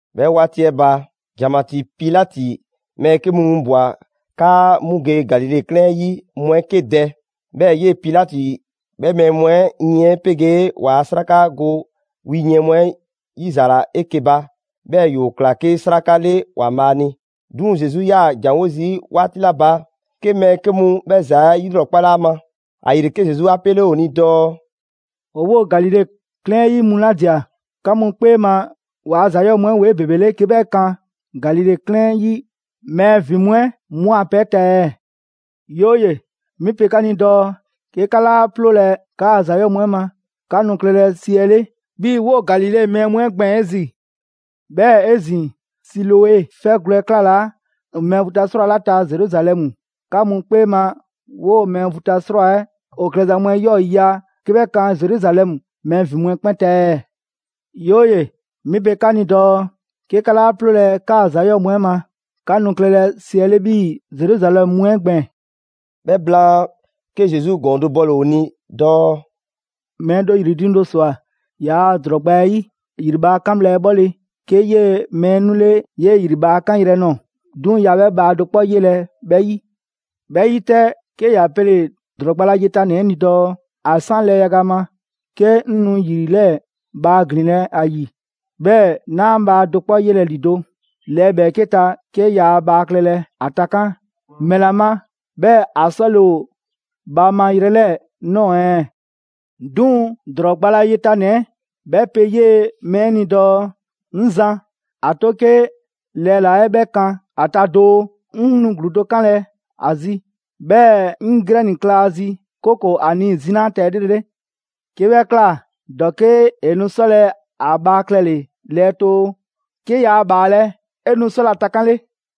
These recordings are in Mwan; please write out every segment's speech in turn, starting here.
'Bhɛ 'waati 'ɛ ba, ‑janmatii Pilati mɛɛ 'ke mu winbwa‑ 'kaa 'mu ge Galile 'klɛɛn 'ɛ 'yi mu 'ɛ 'ke dɛ. 'Bhɛɛ‑ 'yee‑ Pilati 'bhɛ mɛɛ mu 'ɛ yiɛn 'ɛ 'pegee ‑waa' 'sraka go wi yiɛn mu 'ɛ 'yizaala 'eke‑ ba, 'bhɛɛ‑ ‑yoo ꞊kla 'ke 'sraka 'le ‑Waanbhaa' ni. 'Duŋ‑ Zesu 'yaa‑ ‑janwo' zii' 'waati 'la ba, 'ke mɛɛ 'ke mu 'bhɛ ‑za 'ɛ 'yilrɔkpale ‑a ma. ‑Ayile 'ke Zesu 'a 'pele ‑o ni dɔɔ: «‑O 'woo‑ Galile 'klɛɛn 'yi mu 'la ꞊dia, 'ka mu 'kpee ma ‑waa' ‑za 'yɔɔ‑ mu 'ɛ ‑woo 'ebebele 'ke 'bhɛ kan Galile 'klɛɛn 'yi mɛɛ ‑vin mu 'ɛ 'mu a pɛ 'ɛ ta ɛɛ? 'Yooye‑! 'Mi pe 'ka ni dɔɔ 'ke 'ka 'laa 'ploolɛ‑ 'kaa‑ ‑za 'yɔɔ‑ mu 'ɛ ma, 'ka nu klɛlɛ siɛle 'bhii‑ 'woo‑ Galile mɛɛ mu 'ɛ gbɛɛn‑ 'ezin‑. 'Bhɛɛ‑ 'ezin‑, Siloe 'fɛgwlɛ‑ 'ɛ 'klalaa‑ mɛɛ vu ta 'srwaa‑ 'la ta Zeruzalɛmu, 'ka 'mu 'kpee ma 'woo‑ mɛɛ vu ta 'srwaa‑ 'ɛ ‑o klɛza mu 'ɛ 'yɔɔ‑ ‑yiya' 'ke 'bhɛ kan Zeruzalɛmu mɛɛ ‑vin mu 'ɛ 'kpɛn ta ɛɛ? 'Yooye‑! 'Mi pe 'ka ni dɔɔ, 'ke 'ka 'laa 'ploolɛ‑ 'kaa‑ ‑za 'yɔɔ‑ mu 'ɛ ma, 'ka nu klɛlɛ 'siɛle 'bhii‑ Zeruzalɛmu mu 'ɛ gbɛɛn‑.» 'Bhɛ blaan, 'ke Zesu ‑gɔɔn do bɔle‑ ‑o ni dɔɔ: «Mɛɛ do ‑yri diiŋ do ꞊swa ‑yaa' ‑drɔɔ gba 'ɛ 'yi. ‑Yri bhaa 'kan bhla 'ɛ 'bhɔle‑ 'ke 'yee‑ mɛɛ 'ɛ 'nule 'yee‑ ‑yri bhaa 'ɛ 'kanyrɛ‑ ꞊nɔɔ. 'Duŋ‑ yaa 'bhɛ bhaa do 'kpɔ 'yelɛ‑ 'bhɛ 'yi. 'Bhɛ 'yi 'tɛ, 'ke ‑ya pele‑ ‑drɔɔ gba la yetanɛ 'ɛ ni dɔɔ: ‹‑A 'san lɛɛ yaga ma 'ke 'ŋ nu ‑yri 'lɛɛ bhaa ‑glinlɛ' ‑a ‑yi, 'bhɛɛ‑ 'naa ‑a bhaa do 'kpɔ 'yelɛ‑ ‑lido'. Lɛɛ ‑bhɛɛke' ta, 'ke yaa ‑a bhaa klɛlɛ, ‑a takan', ‑mɛla ma 'bhɛɛ‑ ‑a 'sɔle‑ ‑o bhaa ma yrɛ 'lɛɛ‑ ꞊nɔɔ ɛɛ?› 'Duŋ‑ ‑drɔɔ gba la yetanɛ 'ɛ 'bhɛ pe 'yee‑ mɛɛ 'ɛ ni dɔɔ: ‹'Ŋ zan, ‑a 'to 'ke lɛɛla‑ 'ɛ 'bhɛ 'kan 'a ta doo. 'Ŋ nu ‑gluu do 'kanlɛ‑ ‑a zi, 'bhɛɛ‑ 'ŋ grɛni kla ‑a zi 'kooko‑ ‑a nii‑ zinaa' ‑a ta 'elrele. 'Ke 'bhɛ ꞊kla, ‑dɔke' ‑e nu 'sɔlɛ‑ ‑a bhaa klɛle‑ lɛɛtoo. 'Ke yaa ‑bhaalɛ' 'e nu 'sɔlɛ‑ ‑a takanle.›»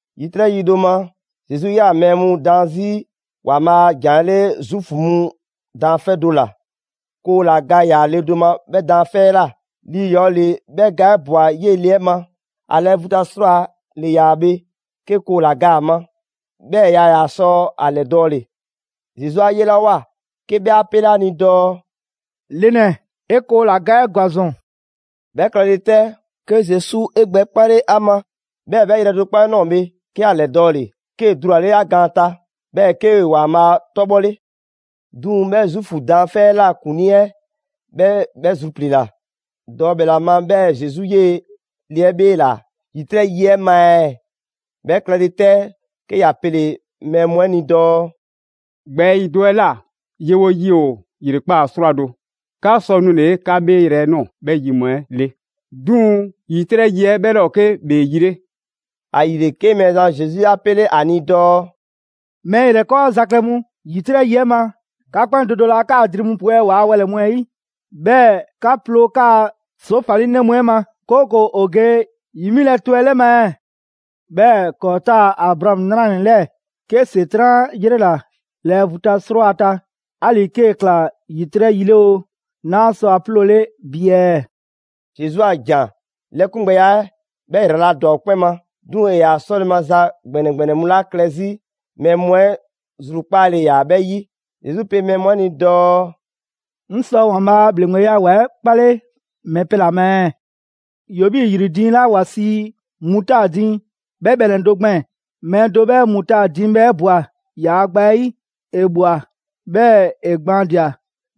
‑Yitrɛ' yi do ma, Zesu 'yaa‑ mɛɛ mu daan 'zi ‑Waanbhaa' a ‑jan 'ɛ 'le Zuufu mu daanfɛ' do ‑la. Koo ‑la ga ‑yaa le do ma 'bhɛ daanfɛ' 'ɛ ꞊la. Lii ‑yɔɔ ‑le 'bhɛ ga 'ɛ ꞊bwa 'yee‑ le 'ɛ ma. ‑A lɛɛ vu ta 'srwaa‑ ‑le ‑yaa bhe, 'ke koo ‑la ga ‑a ma, 'bhɛɛ‑ yaa ‑yaa sɔ ‑a ‑lɛdɔɔle. Zesu 'a 'yelawoa 'ke 'bhɛ 'a 'pele ‑a ni dɔɔ: «Le ‑nɛ, 'e koo ‑la ga 'ɛ ‑gwa ‑zɔn.» 'Bhɛ klɛle 'tɛ, 'ke Zesu 'e gbɛ 'kpale ‑a ma, 'bhɛɛ 'bhɛ yrɛ do 'kpɔ 'ɛ ꞊nɔɔ bhe, 'ke ‑ya ‑lɛdɔɔle, 'kee‑ dulale ‑a gaan ta. 'Bhɛɛ‑ 'kee‑ ‑Waanbhaa' 'tɔbhɔle. 'Duŋ‑ 'bhɛ Zuufu daanfɛ' 'ɛ ꞊la ‑kuŋlii 'ɛ 'bhɛ 'bhɛ zrupliila dɔɔ ‑mɛla ma 'bhɛɛ‑ Zesu 'yee‑ le 'ɛ 'bheela‑ ‑yitrɛ' yi 'ɛ ma ɛɛ. 'Bhɛ klɛle 'tɛ, 'ke ‑ya pele‑ mɛɛ mu 'ɛ ni dɔɔ: «‑Gbɛɛyi' do 'ɛ ꞊la, yewo yi ‑o ‑yrekpaa' 'srwado‑, 'ka 'sɔ nule‑ 'ka 'bheeyrɛ‑ ꞊nɔɔ 'bhɛ yi mu 'ɛ 'le. 'Duŋ‑ ‑yitrɛ' yi 'ɛ 'bhɛ 'laa ‑o 'ke ‑bhee yi 'le.» ‑Ayile, 'ke Mɛɛzan Zesu 'a 'pele ‑a ni dɔɔ: «Mɛɛ ‑yrɛkɔɔza klɛ mu! ‑Yitrɛ' yi 'ɛ ma 'ka 'kpɛn do do laa 'kaa‑ dri mu pwɛ ‑waa' wɛlɛ‑ mu 'ɛ 'yi, 'bhɛɛ‑ 'ka 'ploo‑ 'kaa‑ ‑soofalinɛ mu 'ɛ ma, 'kooko‑ ‑o ge ‑yi 'milɛ‑ tɔ 'ɛ 'lɛ ma ɛɛ? 'Bhɛɛ‑ ‑kɔɔ' 'taa‑ Abraamu 'nranɛ‑ 'lɛɛ‑, 'ke ‑Setran' 'a 'yrela‑ lɛɛ vu ta 'srwaa‑ ta, 'ali‑ 'kee‑ ꞊kla ‑yitrɛ' yi 'le oo, 'naa sɔ a 'ploole bi ɛɛ?» Zesu a ‑jan 'lɛkungbɛya 'ɛ 'bhɛ ‑yraladwa ‑o 'kpɛn ma. 'Duŋ‑ ‑e ‑yaa 'sɔle‑ maza ‑gbɛnɛ ‑gbɛnɛ mu 'la klɛ 'zi, mɛɛ mu 'ɛ zrukpaale ‑yaa 'bhɛ 'yi. Zesu pe mɛɛ mu 'ɛ ni dɔɔ: «'Ŋ sɔ ‑Waanbhaa' a ‑bhleŋgbeya ‑wa 'ɛ 'kpale ‑mɛ pɛ ‑la ma ɛɛ? ‑Yoo 'bhii‑ ‑yri diiŋ 'la ‑wa sii mutaadi 'bhɛ bhɛnɛ‑ do gbɛɛn‑. Mɛɛ do 'bhɛ mutaadi bhɛ ꞊bwa ‑yaa' gba 'ɛ 'yi. ‑E ꞊bhwa, 'bhɛɛ‑ ‑e gbaandia‑,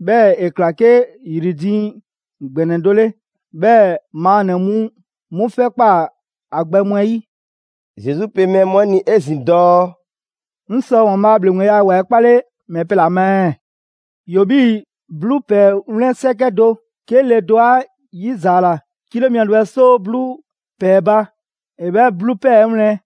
'bhɛɛ‑ ‑e ꞊kla 'ke ‑yri diiŋ ‑gbɛnɛ do 'le. 'Bhɛɛ‑ maannɛ‑ mu 'mu 'fɛ ꞊kpaa ‑a gbɛ mu 'ɛ 'yi.» Zesu pe mɛɛ mu 'ɛ ni 'ezin‑ dɔɔ: «'Ŋ sɔ ‑Waanbhaa' a ‑bhleŋgbeya ‑wa 'ɛ 'kpale ‑mɛ pɛ ‑la ma ɛɛ? ‑Yoo 'bhii‑ 'bluu ‑pɛɛ 'wlɛn 'sɛkɛ do. 'Ke le do 'a 'yizaala 'kilo mia do 'bhɛ 'soo 'bluu ‑pɛɛ ba, ‑e 'bhɛ 'bluu ‑pɛɛ 'ɛ wlɛn.»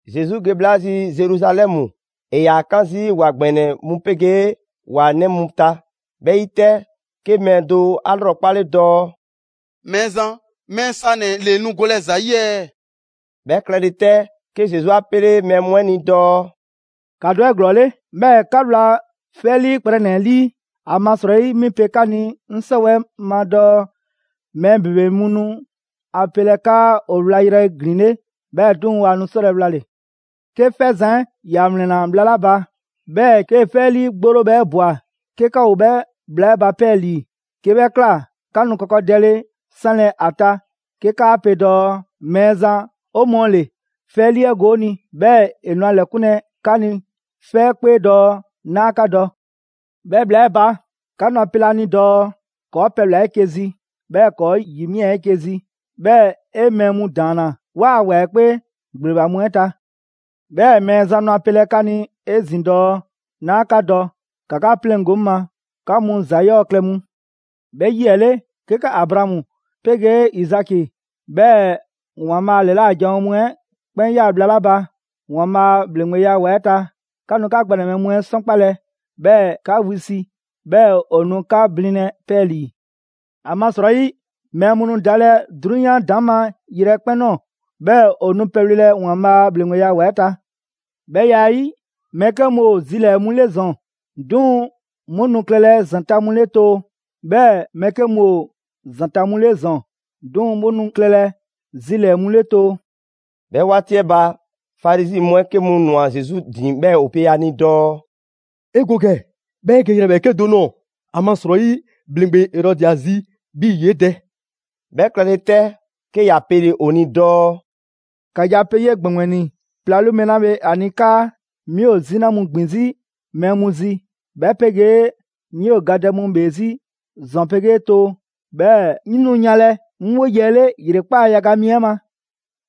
Zesu ge bhla zi Zeruzalɛmu, ‑e ‑yaa 'kan zii' ‑wa ‑gbɛnɛ mu 'pegee ‑wa 'nɛ mu ta. 'Bhɛ 'yi 'tɛ, 'ke mɛɛ do 'a 'lrɔkpale dɔɔ: «Mɛɛzan, mɛɛ sanɛ‑ ‑le nu golɛ ‑za ‑yi ɛɛ?» 'Bhɛ klɛle 'tɛ, 'ke Zesu 'a 'pele mɛɛ mu 'ɛ ni dɔɔ: «‑Ka dɔ 'eglɔɔle, 'bhɛɛ‑ 'ka wla 'fɛlii kprɛnɛ‑ 'ɛ 'lii. ‑Amasrɔyi 'mi pe 'ka ni 'ŋ 'sɔwɛɛ‑ ma dɔɔ mɛɛ ‑bebe mu nu ‑a pelɛ 'kaa ‑o wlayrɛ ‑glinle', 'bhɛɛ‑ 'duŋ‑ waa nu 'sɔlɛ‑ wlale‑.» «'Ke 'fɛzan‑ 'ɛ ‑ya ‑wlɛnna bhla 'la ba, 'bhɛɛ‑ 'kee‑ 'fɛlii 'gborobhɛ 'ɛ ꞊bwa 'ke 'ka ‑o 'bhɛ bhla 'ɛ ba 'pɛɛlii‑. 'Ke 'bhɛ ꞊kla, 'ka nu kɔkɔdɛle 'sanlɛ‑ ‑a ta 'ke 'kaa pe dɔɔ: ‹Mɛɛzan, 'o mɔɔ ‑le, 'fɛ 'ɛ 'liigo‑ 'o ni›. 'Bhɛɛ‑ ‑e nu a ‑lɛkunlɛ 'ka ni 'fɛ 'ɛ 'kpee dɔɔ: ‹'Naa 'ka dɔ.› 'Bhɛ bhla 'ɛ ba, 'ka nu ‑a pelɛ ‑a ni dɔɔ: ‹‑Kɔɔ' pɛbhla‑ 'eke‑ zi, 'bhɛɛ‑ ‑kɔɔ' ‑yi ꞊mia 'eke‑ zi, 'bhɛɛ‑ 'e mɛɛ mu ‑daanna 'waa‑ ‑wa 'ɛ 'kpee ‑gbleba mu 'ɛ ta.› 'Bhɛɛ‑ Mɛɛzan nu ‑a pelɛ 'ka ni 'ezin‑ dɔɔ: ‹'Naa 'ka dɔ, ‑ka 'ka 'pleŋgo‑ 'ŋ ma, 'ka mu ‑za 'yɔɔ‑ klɛ mu.› 'Bhɛ yi 'ɛ 'le, 'ke 'ka Abraamu 'pegee Izaki, 'bhɛɛ‑ ‑Waanbhaa' a ‑lɛla' janwo mu 'ɛ 'kpɛn ꞊ya bhla 'la ba ‑Waanbhaa' a ‑bhleŋgbeya ‑wa 'ɛ ta, 'ka nu 'ka gbɛnɛbhɛ mu 'ɛ 'sɔnkpalɛ 'bhɛɛ‑ 'ka wisi; 'bhɛɛ‑ ‑o nu 'ka blinlɛ 'pɛɛlii‑. ‑Amasrɔyi mɛɛ mu nu dalɛ 'drunyan ‑daŋma' yrɛ 'ɛ 'kpɛn ꞊nɔɔ, 'bhɛɛ‑ ‑o nu pɛbhlelɛ ‑Waanbhaa' a ‑bhleŋgbeya ‑wa 'ɛ ta. 'Bhɛ ya 'ɛ 'yi, mɛɛ 'ke mu ‑o zi zilɛɛ‑ mu 'le ‑zɔn, 'duŋ‑ 'mu nu klɛlɛ ‑zanta' mu 'le too. 'Bhɛɛ‑ mɛɛ 'ke mu ‑o ‑zanta' mu 'le ‑zɔn, 'duŋ‑ 'mu nu klɛlɛ zilɛɛ‑ mu 'le too.» 'Bhɛ 'waati 'ɛ ba, Farizi mu 'ɛ 'ke mu ꞊nwa Zesu ‑din 'bhɛɛ‑ ‑o pe a ni dɔɔ:«'E Go ‑gɛ, 'bhɛɛ‑ 'e ge yrɛ ‑bhɛɛke' do ꞊nɔɔ, ‑amasrɔyi ‑bhleŋgbe Erɔdi ‑a zi 'bhii‑ ‑yee' dɛ.» 'Bhɛ klɛle 'tɛ, 'ke ‑ya pele‑ ‑o ni dɔɔ: «‑Ka ge a pe 'yee‑ ‑gbɛŋgbɛni 'plalu mɛɛ 'la bhe ‑a ni 'kaa: 'Mi ‑o 'zina mu ‑gbin 'zi mɛɛ mu zi; 'bhɛ 'pegee 'ŋ 'yoo‑ gadɛ mu ‑bhee 'zi ‑zɔn 'pegee too. 'Bhɛɛ‑ 'ŋ nu yanlɛ 'ŋ 'woye‑ 'ɛ 'le ‑yrekpaa' yaga mi 'ɛ ma.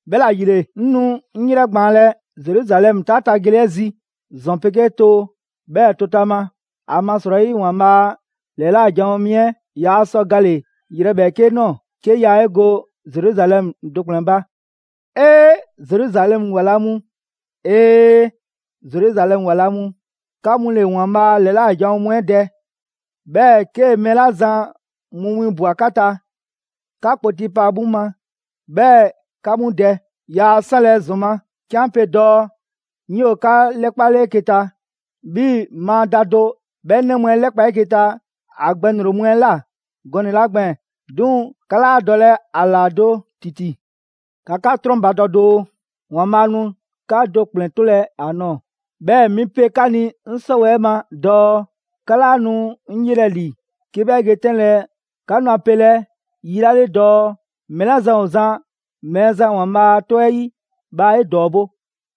'Bhɛla‑ ‑yile, 'ŋ nu 'ŋ 'yrɛgbaanlɛ Zeruzalɛmu 'taa ta gele 'ɛ zi, ‑zɔn 'pegee too, 'bhɛɛ‑ tootama. ‑Amasrɔyi ‑Waanbhaa' a ‑lɛla' janwo mi 'ɛ yaa sɔ gale‑ yrɛ ‑bhɛɛke' ꞊nɔɔ 'ke yaa 'e go Zeruzalɛmu do ‑kplɛn ba. «'Ee! Zeruzalɛmu ‑wa la mu, 'Ee! Zeruzalɛmu ‑wa la mu! 'Ka mu ‑le ‑Waanbhaa' ‑lɛla' janwo mu 'ɛ dɛ, 'bhɛɛ‑ 'kee‑ mɛɛ 'la zan mu 'winbwa‑ 'ka ta, 'ka kpoti pa 'mu ma, 'bhɛɛ‑ 'ka 'mu dɛ. Yaa 'sanlɛ‑ ‑zɔn ma 'ke 'an pe dɔɔ 'ŋ 'yoo‑ 'ka 'lɛkpale 'eke‑ ta 'bhii‑ maa da do 'bhɛ 'nɛ mu 'ɛ 'lɛkpa 'eke‑ ta ‑a gbɛŋroŋ‑ mu 'ɛ ꞊la gɔnɛ‑ 'la gbɛɛn‑. 'Duŋ‑ 'ka 'laa dɔlɛ ‑a ‑la do ‑titi. ‑Ka 'ka 'trɔnbadɔ doo, ‑Waanbhaa' nu 'ka do ‑kplɛn 'tolɛ‑ ‑a nɔɔ‑. 'Bhɛɛ‑ 'mi pe 'ka ni 'ŋ 'sɔwɛɛ‑ 'ɛ ma dɔɔ: 'ka 'laa nu 'ŋ 'yelɛ‑ ‑li 'ke 'bhɛ ge 'tɛnlɛ‑ 'ka nu ‑a pelɛ yi 'la 'le dɔɔ: ‹Mɛɛ 'la zan ‑o zan Mɛɛzan ‑Waanbhaa' 'tɔ 'ɛ 'yi, bhaa 'e ‑dɔɔbo'!›»